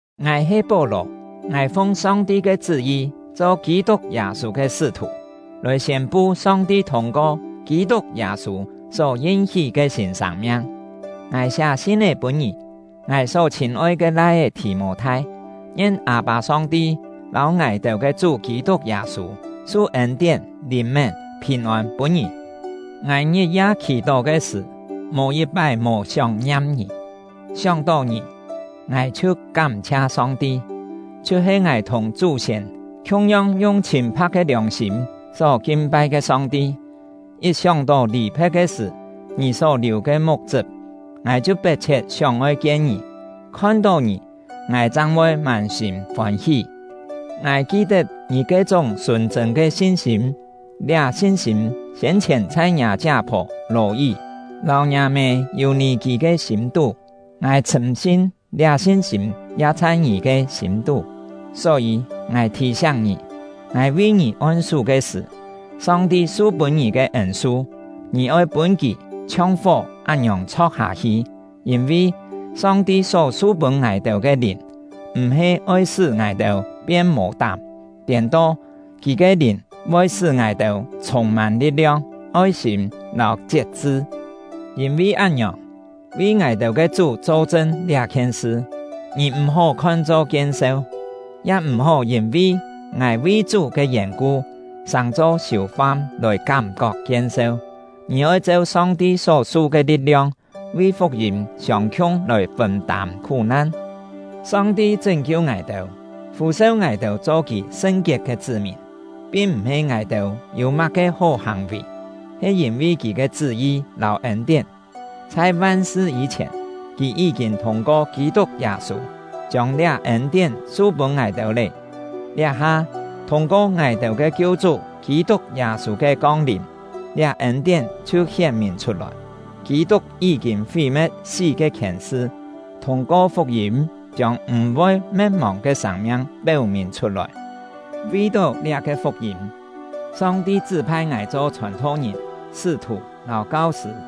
Ngài he Pó-lò; ngài fung Song-ti ke chṳ́-yi cho Kî-tuk Yâ-sû ke sṳ́-thù, lòi siên-pu Song-ti thûng-ko Kî-tuk Yâ-sû só yin-hí ke sîn sâng-miang. Ngài siá sin-é pûn ngì — ngài só chhîn-oi ke lai-é Thì-mô-thai: Ngien Â-pâ Song-ti lâu ngài-têu ke Chú Kî-tuk Yâ-sû su ên-tién, lìn-mén, phìn-ôn pûn ngì! Ngài ngit-ya khì-tó ke sṳ̀, mò yit-pái mò sióng-ngiam ngì; sióng-tó ngì, ngài chhiu kám-chhia Song-ti, chhiu-he ngài thùng chú-siên khiung-yong yung chhîn-pha̍k ke liòng-sîm só kin-pai ke Song-ti. Yit sióng-tó lì-phe̍t ke sṳ̀ ngì só liù ke muk-chṳp, ngài chhiu pet-chhiet sióng-oi kien ngì; khon-tó ngì, ngài chang voi mân-sîm fôn-hí. Ngài ki-tet ngì ke-chúng sùn-chṳ̂n ke sin-sîm; liá sin-sîm siên-chhièn chhai ngiâ chiá-phò Lò-yí lâu ngiâ-mê Yû-nì-kî ke sîm-tú; ngài chhṳ̂m-sin, liá sin-sîm ya chhai ngì ke sîm-tú. Só-yî, ngài thì-siáng ngì: Ngài vi ngì on-sú ke sṳ̀, Song-ti su-pûn ngì ke ên-su, ngì oi pûn kì chhiong fó án-ngiòng chho̍k-hâ-hi. Yîn-vi, Song-ti só su-pûn ngài-têu ke Lìn, m̀-he oi sṳ́ ngài-têu pien mò-tám; tiên-to, Kì ke Lìn voi sṳ́ ngài-têu chhûng-mân li̍t-liong, oi-sîm, lâu chiet-chṳ. Yîn-vi án-ngiòng, vi ngài-têu ke Chú cho-chṳn liá-khien sṳ, ngì m̀-hó khon-cho kien-seu, ya m̀-hó yîn-vi ngài vi Chú ke yèn-ku sàng-cho siù-fam lòi kám-kok kien-seu. Ngì oi cheu Song-ti só-su ke li̍t-liong, vi fuk-yîm siông-khiung lòi fûn-tâm khú-nan. Song-ti chṳ́n-kiu ngài-têu, fû-seu ngài-têu cho Kì sṳn-kiet ke chṳ́-mìn, pin m̀-he ngài-têu yû má-ke hó hàng-vì, he yîn-vi Kì ke chṳ́-yi lâu ên-tién. Chhai van-sṳ yî-chhièn, Kì yí-kîn thûng-ko Kî-tuk Yâ-sû chiông liá ên-tién su-pûn ngài-têu lé; liá-ha, thûng-ko ngài-têu ke Kiu-chú Kî-tuk Yâ-sû ke kong-lìm, liá ên-tién chhiu hién-mìn chhut-lòi. Kî-tuk yí-kîn fí-me̍t sí ke khièn-sṳ, thûng-ko fuk-yîm chiông m̀-voi me̍t-mòng ke sâng-miang péu-mìn chhut-lòi. Vi-tó liá-ke fuk-yîm, Song-ti chṳ́-phai ngài cho chhòn-tho-ngìn, sṳ́-thù, lâu kau-sṳ̂.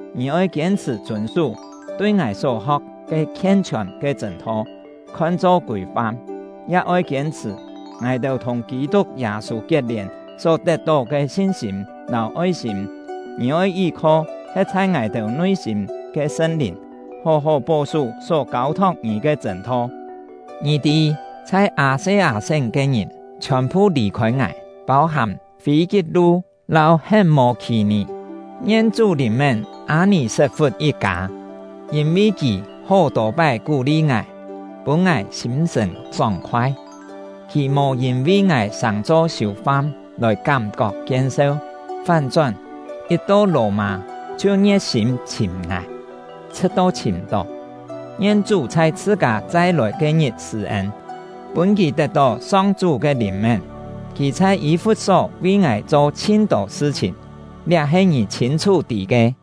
Ngì oi kiên-chhṳ̀ chûn-sú tui ngài só-ho̍k ke khien-chhiòn ke chṳ̂n-tho, khon-cho kûi-fam, ya oi kiên-chhṳ̀ ngài-têu thùng Kî-tuk Yâ-sû kiet-lièn só tet-tó ke sin-sîm lâu oi-sîm. Ngì oi yí-kho he̍t chhai ngài-têu nui-sîm ke Sṳn-Lìn, hó-hó pó-sú só kâu-thok ngì ke chṳ̂n-tho. Ngì tî, chhai Â-se-â-sén ke ngìn chhiòn-phu lì-khôi ngài, pâu-hàm Fî-kit-lu lâu Het-mô-khì-nì. Ngien Chú lìn-mén Â-nì-set-fut yit-kâ; yîn-vi kì hó-tô pái kú-li ngài, pûn ngài sîm-sṳ̀n sóng-khoai. Kì mò yîn-vi ngài sàng-cho siù-fam lòi kám-kok kien-seu, fán-chón, yit to Lò-mâ chhiu ngie̍t-sîm chhìm ngài, chhṳ̍t-to chhìm-tó. Ngien Chú chhai chhṳ-kâ chai-lòi ke-ngit sṳ̂-ên, pûn kì tet-tó Song-chú ke lìn-mén! Kì chhai Yî-fut-só vi ngài cho chhin-tô sṳ-chhìn, liá he ngì chhîn-chhú tî ke.